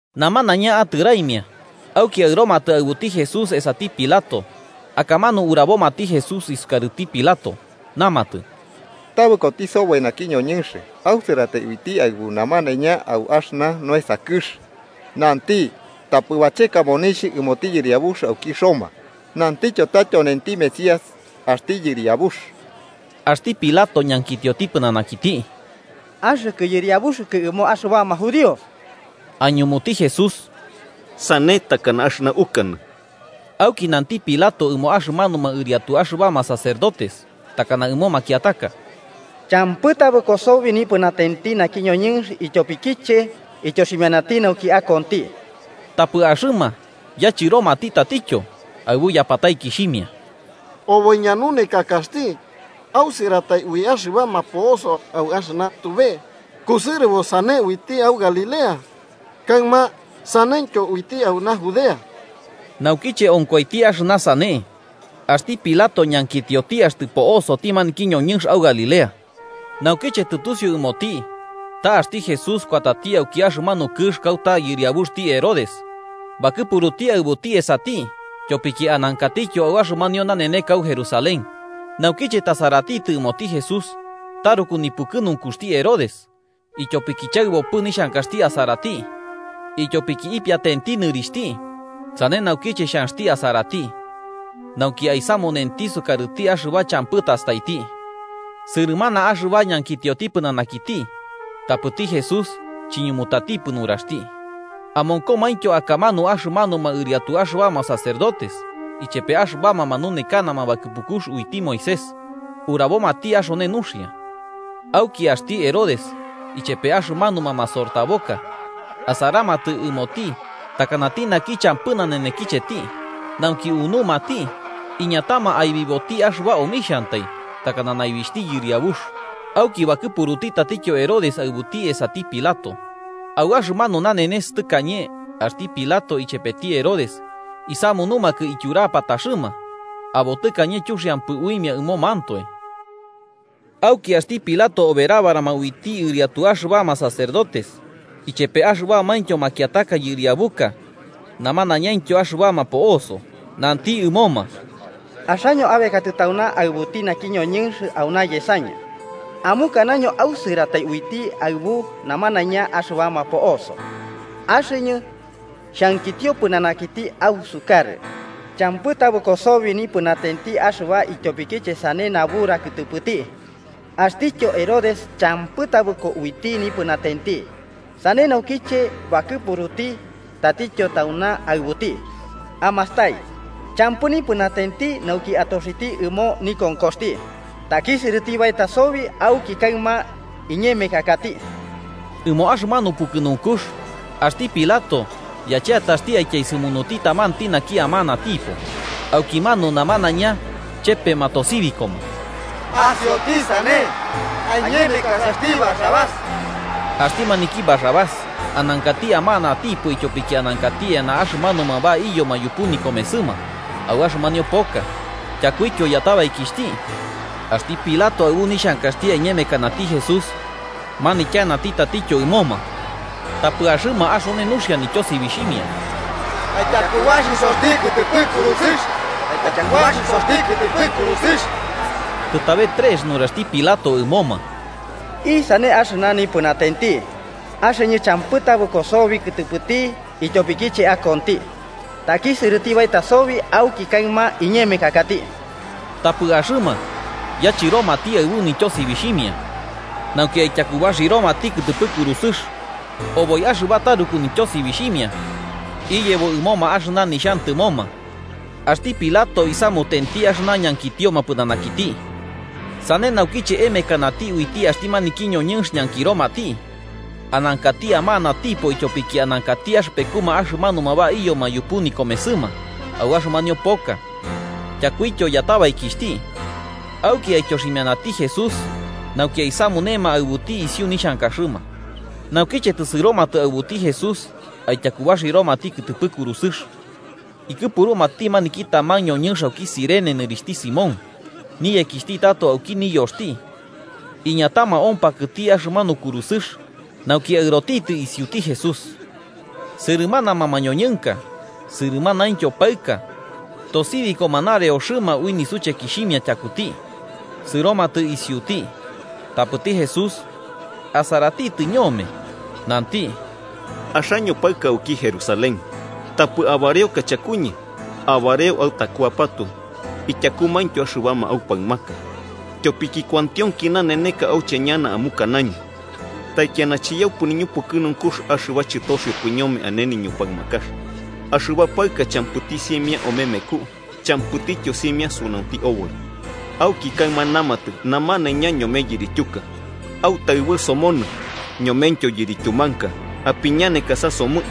Namanaiña atɨraimia, auki aɨromatɨ aɨbuti Jesús esati Pilato. Akamanu urabomati Jesús isukarɨti Pilato. Namatɨ: –Tabɨkoti soboi naki ñoñɨnx ausɨratai uiti aɨbu namanaiña au axɨna noesa kɨx. Nanti tapɨ bacheka monixh ɨmoti Yɨriabux auki Roma, nantityo ta tyonenti Mesías, axti Yɨriabux. Axti Pilato ñankitioti pɨnanakiti: –¿Axɨkɨ yɨriabuxɨkɨ ɨmo axɨbama judíos? –Aiñumuti Jesús–sane takana axɨna ukanɨ. Auki nanti Pilato ɨmo axɨmanuma ɨriatu axɨbama sacerdotes takana ɨmo makiataka: –Champɨ tabɨko sobi nipɨnatenti naki ñoñɨnx ityopikiche ityoximianati nauki akonti. Tapɨ axɨma yachɨromati tatityo aɨbu yapataikixhimia: –Oboi ñanunekakaxti ausɨratai ui axɨbama po'oso au axɨna tube. Kusɨrɨbo sane uiti au Galilea, kaɨma saneityo uiti auna, Judea. Naukiche onkoiti axɨna sane, axti Pilato ñankitioti axtɨ po'osti maniki ñoñɨnx au Galilea. Naukiche tɨtusiu ɨmoti ta axti Jesús kuatati auki axɨmanu kɨx kauta yɨriabuxti Herodes, bakɨpuruti aɨbuti esati, tyopiki anankatityo au axɨmanio naneneka au Jerusalén. Naukiche tasaratitɨ ɨmoti Jesús, taruku nipukɨnunkuxti Herodes, ityopiki chaɨbopɨ nixhankaxti asarati, ityopiki ipiatenti nɨrixhti sane naukiche xhanxti asarati nauki aisamunenti sukarɨti axɨba champɨ tastaiti. Sɨrɨmana axɨba ñankitioti pɨnanakiti, tapɨti Jesús chiñumutatipɨ nuraxti. Amonkomaintyo akamanu axɨmanuma ɨriatu axɨbama sacerdotes ichepe axɨbama manunekanama bakɨpukux uiti Moisés, urabomati axone nuxia. Auki axti Herodes ichepe axɨmanuma masortaboka asaramatɨ ɨmoti takanati naki champɨ nanenekicheti, nauki unumati iñatama aibiboti axɨba omixhantai, takana naibixhti yɨriabux. Auki bakɨpuruti tatityo Herodes aɨbuti esati Pilato. Au axɨmanu nanenes tɨkañe axti Pilato ichepeti Herodes isamunumakɨ ityurapataxɨma, abo tɨkañe chuxiampɨ uimia ɨmomantoe. Auki axti Pilato oberabarama uiti ɨriatu axɨbama sacerdotes, ichepe axɨbamaintyo makiataka yɨriabuka namanaiñaintyo axɨbama po'oso, nanti ɨmoma: –Axaño abekatɨ tauna aɨbuti naki ñoñɨnx auna yesañɨ, amukanaño ausɨratai uiti aɨbu namanaiña axɨbama po'oso. Axɨñɨ xhankitio pɨnanakiti ausukarɨ champɨ tabɨko sobi nipɨnatenti axɨba ityopikiche sane nabura kɨtɨpɨti. Axtityo Herodes champɨ tabɨko uiti nipɨnatenti, sane naukiche bakɨpuruti tatityo tauna aɨbuti. Amastai, champɨ nipɨnatenti nauki atoxiti ɨmo nikonkoxti. Takisɨrɨti baeta sobi auki kaɨma iñemekakati. Ɨmo axɨmanu pukɨnunkux axti Pilato yacheataxti aityaesɨmunuti tamanti naki amanatipo. Aukimanu namanaiña chepema tosibikoma: –¡Asioti sane! ¡Aiñemekasaxti Barrabás! Axti maniki Barrabás anankati amanatipo ityopiki anankati eana axɨmanuma baiyoma yupu nikomesɨma au axɨmanio poka, tyakuityo yatabaikixhti. Axti Pilato, aɨbu nixhankaxti aiñemekanati Jesús, manityanati tatityo ɨmoma. Tapɨ axɨma axone nuxia nityosibixhimia: –¡Aityakubaxisoxti kɨtɨpɨ kurusɨx! ¡Aityakubaxisoti kɨtɨpɨ kurusɨx! Tɨtabe trex nuraxti Pilato ɨmoma: –¿Isane axɨna nipɨnatenti? Axɨñɨ champɨ tabɨko sobi kɨtɨpɨti ityopikiche akonti. Takisɨrɨti baeta sobi auki kaɨma iñemekakati. Tapɨ axɨma yachɨromati aɨbu nityosibixhimia, nauki aityakubaxiroti kɨtɨpɨ kurusɨx. Oboi axɨba taruku nityosibixhimia iyebo ɨmoma axɨna nixhantɨmoma. Axti Pilato isamutenti axɨna ñankitioma pɨnanakiti. Sane naukiche emekanati uiti axti maniki ñoñɨnx ñankiromati, anankati amanatipo ityopiki anankati axɨpekuma axɨmanuma baiyoma yupu nikomesɨma au axɨmanio poka, tyakuityo yatabaikixhti, auki aityoximianati Jesús nauki aisamunema aɨbuti isiu nixhankaxɨma. Naukiche tɨsɨromatɨ aɨbuti Jesús aityakubaxiromati kɨtɨpɨ kurusɨx, ikɨpurumati maniki taman ñoñɨnx auki Cirene nɨrixhti Simón, niyekixhti tato auki niyoxti, iñatama ompakɨti axɨmanu kurusɨx nauki aɨrotitɨ isiuti Jesús. Sɨrɨmanama mañoñɨnka sɨrɨmanaintyo paɨka tosibikoma nareoxɨma ui nisuchekixhimia tyakuti, sɨromatɨ isiuti. Tapɨti Jesús asaratitɨ ñome nanti: –Axaño paɨka auki Jerusalén, tapɨ abareoka chakuñɨ, abareo autakuapatoe ityakuityo axɨbama aupaɨmaka. Tyopiki kuantionki naneneka auche ñana amukanaño: ‘Taikiana chiyaupɨ niñupukɨnunkux axɨba chɨtoxiopɨ ñome ane ñupaɨmakax, axɨba paɨka champɨti simia omemeku champɨtityo simia sunaunti oboi.’ Auki kaɨma namatɨ namanaiña ñome yirityuka: ‘¡Autaɨbɨ somonɨ!’, ñomentyo yirityumanka: ‘¡Apiñanekasa somɨ!’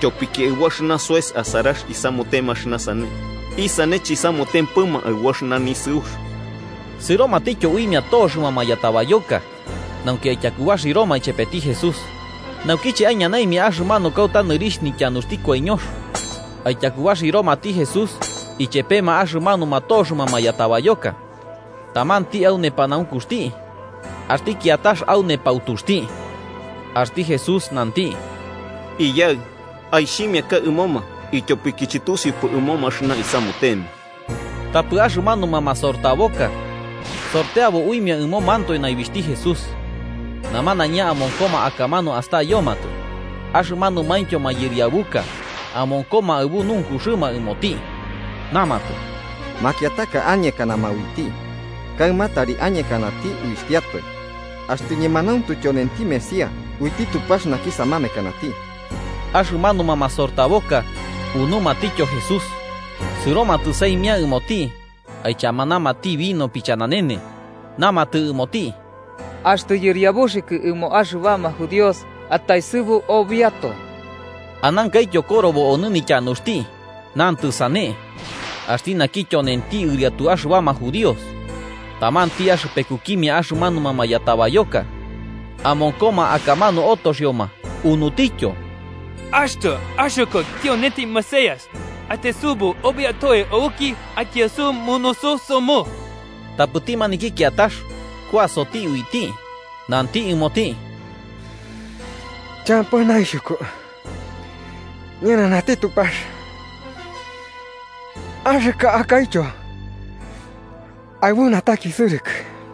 Tyopiki aɨbu axɨna soes asarax isamutema axɨna sane, ¿isane chisamutempɨma aɨbu axɨna nisɨux? Sɨromatityo uimia toxɨma mayatabayoka, nauki aityakubaxiroma ichepeti Jesús. Naukiche aiñanaimia axɨmanu kauta nɨrixh Nityanuxti Koiñox, aityakubaxiromati Jesús ichepema axɨmanuma toxɨma mayatabayoka, tamanti au nepanaunkuxti axti kiatax au nepautuxti. Axti Jesús nanti: “Iyaɨ, aixhimiaka ɨmoma, ityopiki chɨtusiupɨ ɨmoma axɨna isamutema.” Tapɨ axɨmanuma masortaboka sorteabo uimia ɨmomantoe naibixhti Jesús. Namanaiña amonkoma akamanu astayomatɨ. Axɨmanumaintyo mayɨriabuka amonkoma aɨbu nunkuxɨma ɨmoti, namatɨ: –Makiataka añekanama uiti. Kaɨma tari añekati uixhtiatoe, axtɨ ñemanauntu tyonenti Mesías uiti Tupax naki samamekanati. Axɨmanuma masortaboka unumatityo Jesús. Sɨromatɨ saimia ɨmoti, aichamanamati vino pichananene, namatɨ ɨmoti: –¡Axtɨ yɨriabuxɨkɨ ɨmo axɨbama Judíos, ataesɨbu obiatoe! Anankaityo korobo onɨ nityanuxti, nantɨ sane: “Axti naki tyonenti ɨriatu axɨbama judíos.” Tamanti axɨpekukimia axɨmanuma mayatabayoka amonkoma akamanu otoxioma, unutityo: –¡Axtɨ axɨkɨ tyonenti Mesías, ataesɨbu obiatoe auki aityaesɨmunusu somɨ! Tapɨti maniki kiatax kuasoti uiti, nanti ɨmoti: –¿Champɨ naixhuku ñɨnanati Tupax, axɨkɨ akaityo aɨbu natakisɨrɨkɨ?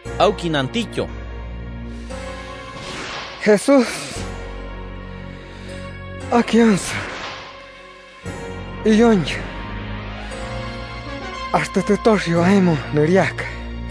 Auki nantityo: –Jesús, akionsɨ iyoñɨ axtɨ tɨtoxio aemo nɨriaka.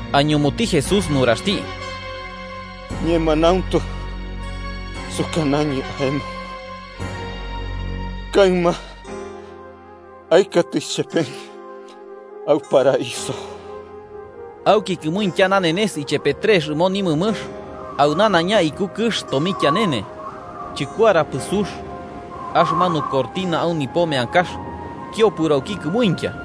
Aiñumuti Jesús nuraxti: –Ñemanauntu sukanañɨ aemo kaɨma aɨkatɨ ichepeñɨ au paraiso. Auki kɨmuintya nanenes ichepe trex ɨmo nimɨmɨx, au nanaiña iku kɨx tomikianene. Chɨkuarapɨ sux, axɨmanu cortina au nipo meankax kiopɨro auki kɨmuintya.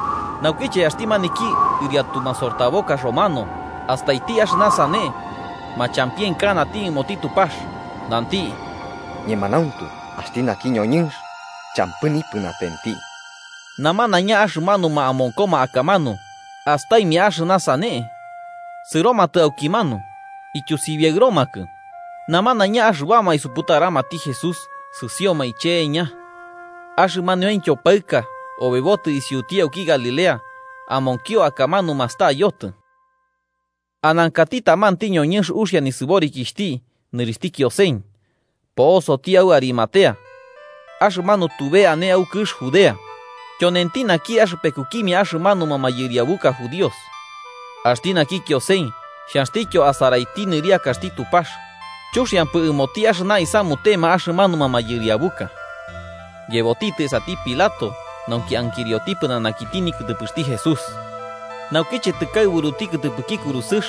Naukiche axti maniki ɨriatu masortaboka romano astaiti axɨna sane, machampienkanati ɨmoti Tupax, nanti: –Ñemanauntu, axti naki ñoñɨnx champɨ nipɨnatenti. Namanaiña axɨmanuma amonkoma akamanu astaimia axɨna sane, sɨromatɨ aukimanu, ityusibiaɨromakɨ. Namanaiña axɨbama isuputaramati Jesús sɨsioma iche'eña. Axɨmaniointyo paɨka obebotɨ isiuti auki Galilea amonkio akamanu mastayotɨ. Anankati tamanti ñoñɨnx uxia nisɨborikixhti nɨrixhti Kiosen, po'osoti au Arimatea, axɨmanu tube ane au kɨx Judea. Tyonenti naki axɨpekukimia axɨmanuma mayɨriabuka judíos. Axti naki Kiosen, xhanxtityo asaraiti nɨriakaxti Tupax chuxiampɨ ɨmoti axɨna isamutema axɨmanuma mayɨriabuka, yebotitɨ esati Pilato nauki ankirioti pɨnanakiti nikɨtɨpɨxti Jesús. Naukiche tɨkaɨburuti kɨtɨpɨki kurusɨx,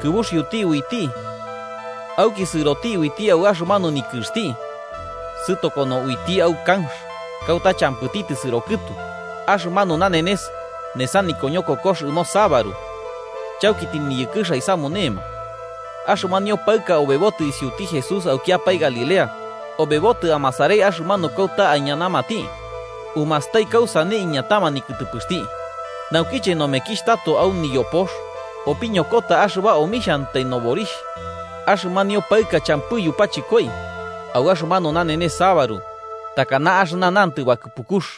kɨbuxiuti uiti auki sɨroti uiti au axɨmanu nikɨxti sɨtokono uiti au kanx, kauta champɨti tɨsɨro kɨtu. Axɨmanu nanenes nesa nikoñokokox ɨmo sabaru, chauki tɨniyɨkɨx aisamunema. Axɨmanio paɨka obebotɨ isiuti Jesús aukiapae Galilea, obebotɨ amasarai axɨmanu kauta aiñanamati, umastai kausane iñatama nikɨtɨpɨxti. Naukiche nomekixh tato au niyopox, opikoñokota axɨba omixhantai noborixh. Axɨmanio paɨka champɨ yupachɨkoi au axɨmanu nanenes sabaru, takana axɨna nantɨ bakɨpukux.